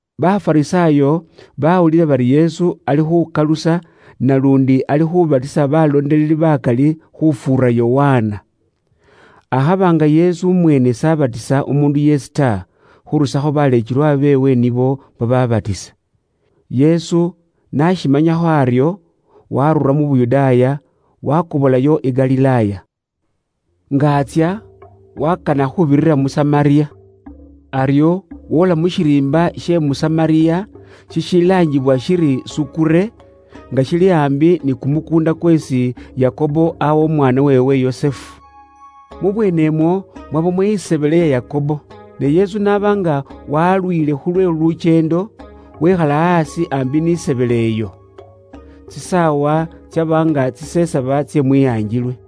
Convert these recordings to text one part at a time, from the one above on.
Bafarisaayo baawulila bari Yesu ali khuukalusa naluundi ali khuubatisa baleekelwa bakali khufuura Yokana. Akhaba nga Yesu umweene s'abatisa umuundu yeesi ta, khurusakho baleekelwa beewe nibo babaabatisa. Yesu n'ashimanyakho aryo, waarura mu Yuda, wakobolayo i Galilaaya. Nga atsya, waakana khuubirira mu Samariya. Aryo woola mu shiriimba she mu Samariya, shishilaangibwa shiri Sukure, nga shili aambi ni kumukuunda kweesi Yakobo aawa umwaana weewe Yusufu. Mu bweenemwo mwabamo isebele ya Yakobo. Ne Yesu n'aba nga waaluwile khu lwe lukyeendo, wikhala aasi aambi n'isebele iyo. Tsisaawa tsyaba nga tsisesaba tsye mwihangilwe.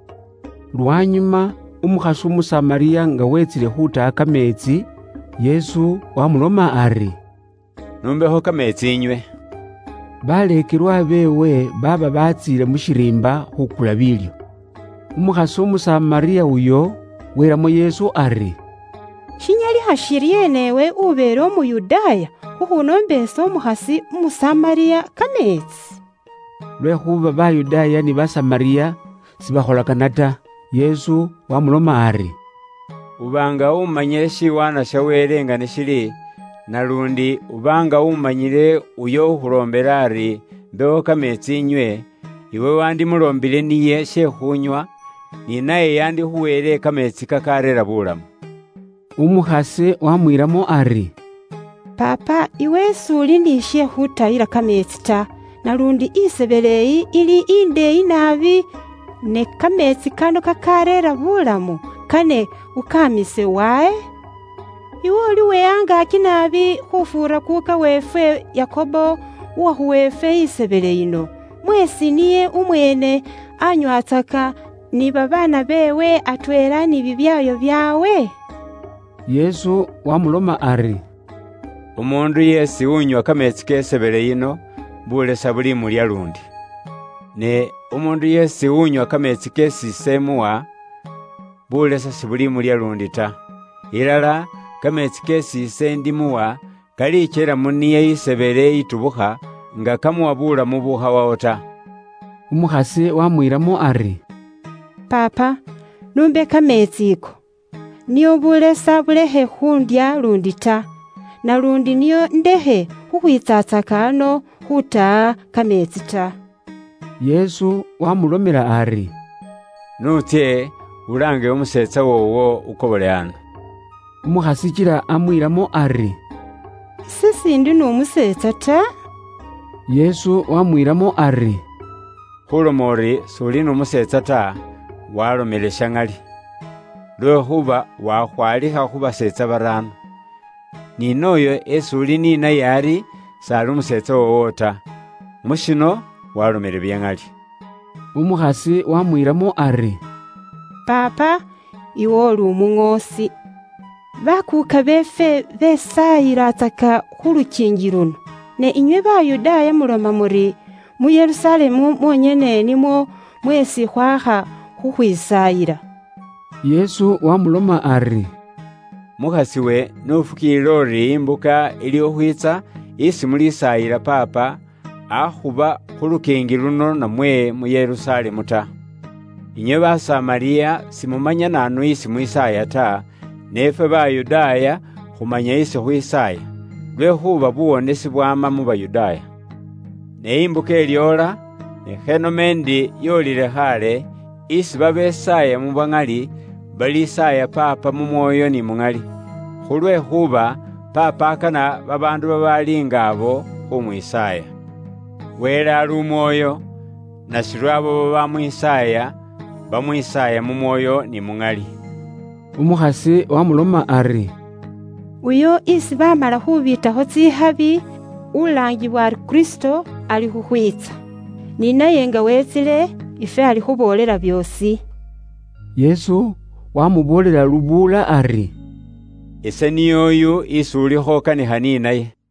Lwanyuma umukhasi Umusamariya nga wetsile khutaha kameetsi, Yesu waamuloma ari, “N'umbekho kameetsi inywe.” Baleekelwa beewe baaba baatsiile mu shiriimba khuukula biilyo. Umukhasi Umusamariya uyo welamo Yesu ari, “Shinyalikha shiryeena iwe ubeele Umuyudaaya, khukhunoomba ise, umukhasi Umusamariya, kameetsi?” Lwekhuuba Bayudaaya ni Basamariya sibakholakana ta. Yesu waamuloma ari, “Uba nga umanyile shiwaanwa sha Wele nga ni shili, naluundi uba nga umanyile uyo ukhuloombile ari, ‘imbekho kameetsi inywe,’ Iwe wandimuloombile she khuunywa, ni naye yandikhuweele kameetsi kakareera buulamu.” Umukhasi wamwiilamo ari, “Paapa, iwe s'uli ni she khuutayila kameetsi ta, naluundi isebele iyi, ili indeeyi naabi, ne kameetsi kano kakaareera buulamu, kane ukaamiise wahe? Iwe uli uwe angaaki naabi khufuura kuuka weefwe Yakobo uwakhuwa ifwe isebele yino, mweesi niye umweene anywatsaka, ni babaana beewe, atweela ni bibyaayo byaabwe?” Yesu wamuloma ari, “Umuundu yeesi unywa kameetsi ke isebele yino, bulesa buli mulya luundi. Ne umuundu yeesi unywa kameetsi keesi ise imuwa, buulesa sibulimulya luundi ta. Ilala kameetsi keesi ise imuwa kalikyela mu niye isebele itubukha, nga kamuwa buulamu bubukhawawo ta.” Umukhasi waamwiilamo ari, “Paapa n'umbe kameetsi ako, nio buulesa bulekhe khuundya luundi ta. Naluundi nio indekhe khukhwiitsatsaka ano khuutaha kameetsi ta.” Yesu waamulomela ari, “N'utsye, ulaange umuseetsa woowo, ukobole ano.” Umukhasi kila amwiilamo ari, “Ise s'indi n'umuseetsa ta.” Yesu waamwiilamo ari, “Khuuloma uri s'uli n'umuseetsa ta, waalomele sha ŋali. Lwekhuuba wakhwaalikha khu baseetsa baraano. Ni nooyo esi uli ni naye ari, s'ali umuseetsa woowo ta. Mu shino, waalomele bya ŋali.” Umukhasi waamwiilamo ari, “Paapa, iwe uli umuŋoosi! Bakuuka beefwe besaayilatsaka khu lukiingi luno, ne inywe Bayudaaya muloma muri, mu Yerusalemu mwonyene nimwo mweesi khwakha khukhwisaayila.” Yesu waamuloma ari, “Mukhas'iwe, n'ufukiilile uri imbuka ili khukhwiitsa isi mulisaayila Paapa, akhuba khu lukiingi luno namwe mu Yerusalemu ta. Inywe Basamariya simumanya naanu isi mwisaaya ta, ne ifwe Bayudaaya khumanya isi khwisaaya. Lwekhuuba buwonesi bwama mu Bayudaaya. Ne imbuka ilyoola, ne khanome ndi yoolile khaale, isi babesaaya mu bwa ŋali, balisaaya Paapa mu Mwoyo ni muŋali, khulwekhuuba Paapa akana babaandu babaali nga abo khuumwisaaya. Wele ali Umwoyo, nashiryo abo babaamwisaaya, baamwisaaya mu Mwoyo ni mu Ŋali.” Umukhasi waamuloma ari, “Uyo isi baamala khuubiitakho tsikhabi (ulaangibwa ari Kristo), alikhukhwiitsa. Ni naye nga weetsile, ifwe alikhuboolela byoosi.” Yesu waamuboolela lubuula ari, “Ise niy'oyu isi ulikho ukanikha ni naye.”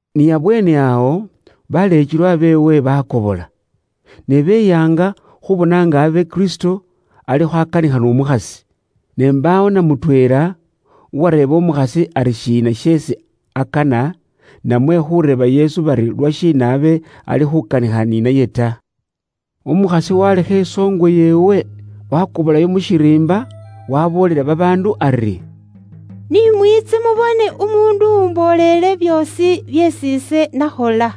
Ni abweene awo, baleekelwa beewe baakobola. Ne beyaanga khuubona nga abe Kristo alikho akanikha n'umukhasi. Ne mbaawo na mutweela uwareeba umukhasi ari shiina sheesi akana, namwe khuureeba Yesu bari lwashiina aba ali khuukanikha ni naye ta. Umukhasi waalekha isoongwe yeewe, waakobolayo mu shiriimba, waaboolela babaandu ari, “Ni mwiitse mubone umuundu uwumboolele byoosi byeesi ise nakhola.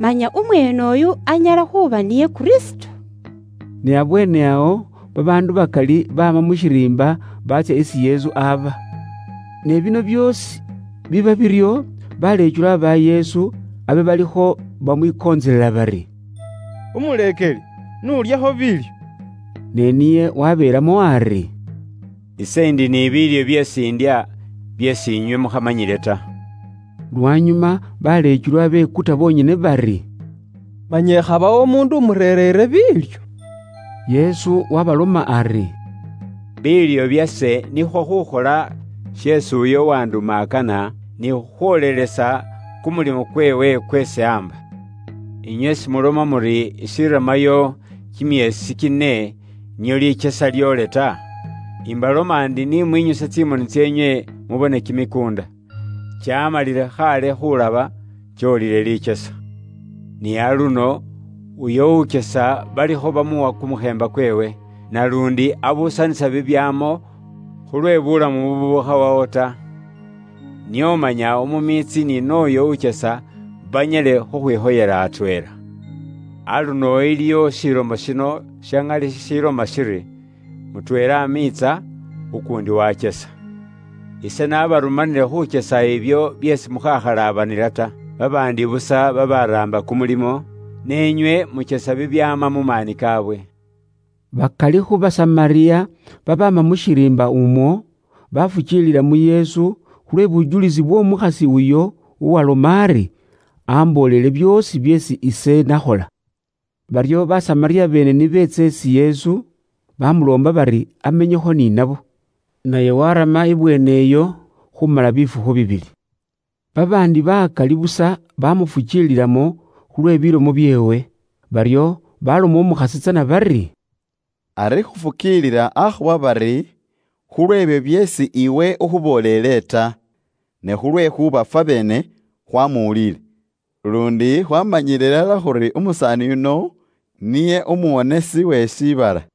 Manya umweene uyu anyala khuuba niye Kristo?” Ni abweene awo babaandu bakali baama mu shiriimba baatsya isi Yesu aba. Ne bino byoosi biba biryo, baleekelwa ba Yesu abe balikho bamwikontselela bari, “Umuleekeli, n'ulyekho biilyo.” Ne niye wabeelamo ari, “Ise ndi ni biilyo byeesi indya, byeesi inywe mukhamanyile ta.” Lwanyuma baleekelwa bekuta bonyene bari, “Manya ikhabawo umuundu umurereere biilyo?” Yesu waabaloma ari, “Biilyo byase nikhwo khuukhola sheesi uyo uwanduma akana, ni khukhwoolelesa kumulimo kweewe kweesi aamba. Inywe simuloma muri ishiramayo kimyeesi kine nio likyesa lyoole ta? Imbaloma ndi ni mwinyuse tsimoni tseenywe mubone kimikuunda! Kyaamalile khaale khuulaba, kyoolile likyesa. Ni aluno, uyo ukyesa balikho bamuwa kumukheemba kweewe, naluundi abuusanisa bibyaamo khulwe buulamu bubukhawawo ta. Nio manya umumiitsi ni nooyo ukyesa banyale khukhwikhoyela atweela. Aluno iliwo shilomo shino sha ŋali shishiloma shiri, ‘Mutweela amiitsa, ukuundi wakyesa.’ Ise nabarumanile khukyesa ibyo byeesi mukhakhalabanila ta. Babaandi busa babaraamba kumulimo, ne inywe mukyesa bibyaama mu maani kaabwe.” Bakali khu Basamariya babaama mu shiriimba umwo, bafukiilila mu Yesu khu lwe bujulisi bw'omukhasi uyo uwaaloma ari, “Amboolele byoosi byeesi ise nakhola.” Baryo Basamariya beene ni beetsa isi Yesu, bamuloomba bari amenyekho ni nabo. Naye warama ibweene iyo khumala bifukhu bibili. Babaandi bakali busa bamufukiililamo khu lwe bilomo byeewe. Baryo baloma umukhasi tsana bari, “Ari khufukiilila akhuba bari khu lweebyo byeesi iwe ukhuboolele ta, ne khulwekhuuba fwabeene khwamuwulile, luundi khwaamanyiile ilala khuri umusaani yuno niye Umuwonesi we shiibala.”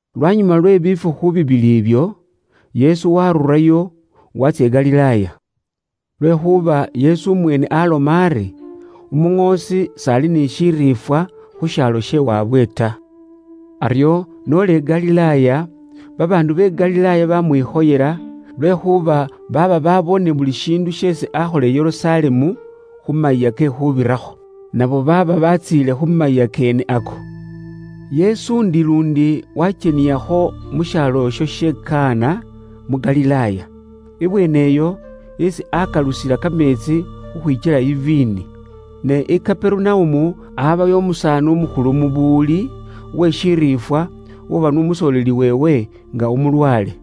Lwanyuma lwe bifukhu bibili ibyo, Yesu waarurayo waatsya i Galilaaya. Lwekhuuba Yesu umweene aloma ari, “Umuŋoosi s'ali ni shiriifwa khu shaalo she waabwe ta.” Aryo n'ola i Galilaaya, babaandu be Galilaaya bamwikhoyela, lwekhuuba baaba baboone buli shiindu sheesi akhola mu Yerusalemu, khu Mayiiya ke Khuubirakho. Nabo baaba batsiile khu mayiiya keene ako. Yesu ndi luundi wakyeniyakho mu shaalo isho she Kana, mu Galilaaya. Ibweene iyo esi aakalusila kameetsi khukhwikyela iviini. Ne i Kaperunaumu, aabayo umusaani umukhulu mu buwuli, uwe shiriifwa, uwaba n'umusoleeli weewe, nga umulwaale.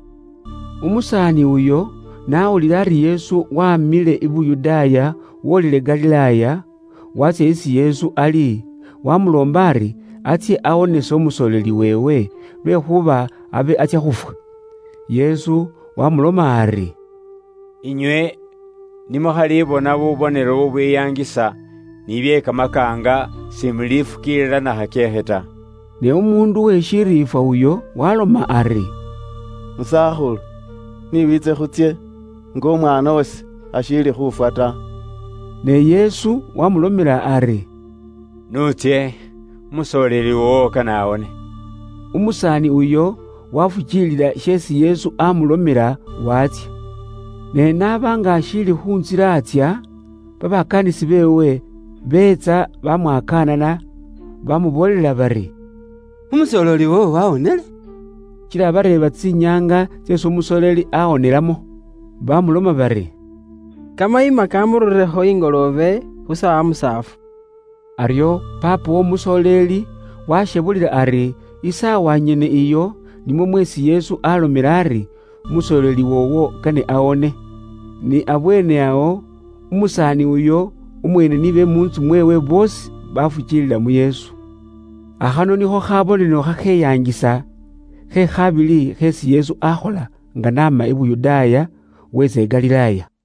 Umusaani uyo n'awulila ari Yesu waamile i Yuda wolile i Galilaaya, waatsya isi Yesu ali, waamuloomba ari atsye awonese umusoleeli weewe, lwekhuuba abe atsya khufwa. Yesu wamuloma ari, “Inywe ni mukhalibona bubonelo bubwiyangisa, ni bye kamakaanga, simulifukiilila na khakyeekhe ta.” Ne umuundu uwe shiriifwa uyo, waaloma ari, “Musakhulu, ni wiitse khutsye nga umwaana wase ashiili khufwa ta.” Ne Yesu waamulomela ari, “N'utsye, umusoleeli woowo kane awone.” Umusaani uyo wafukiilila sheesi Yesu aamulomela, waatsya. Ne n'aba nga ashiili khu ntsila atsya, babakaanisi beewe, beetsa bamwakaanana, baamuboolela bari, “Umusooleli woowo waawonile.” Kila abareeba tsinyaanga tseesi umusoleeli aawonelamo. Baamuloma bari, “Kamayima kaamururirekho ingoloobe, khu saawa musaafu.” Aryo paapa w'omusooleli washebulila ari isaawa nyene iyo, nimwo mweesi Yesu alomela ari, “Umusooleli woowo kane awone.” Ni abweene awo, umusaani uyo umweene ni be mu ntsu mweewe boosi bafukiilila mu Yesu. Akhano nikho khabonelo khakheyangisa, khe khaabiili kheesi Yesu aakhola nga n'ama i Yuda wiitsa i Galilaaya.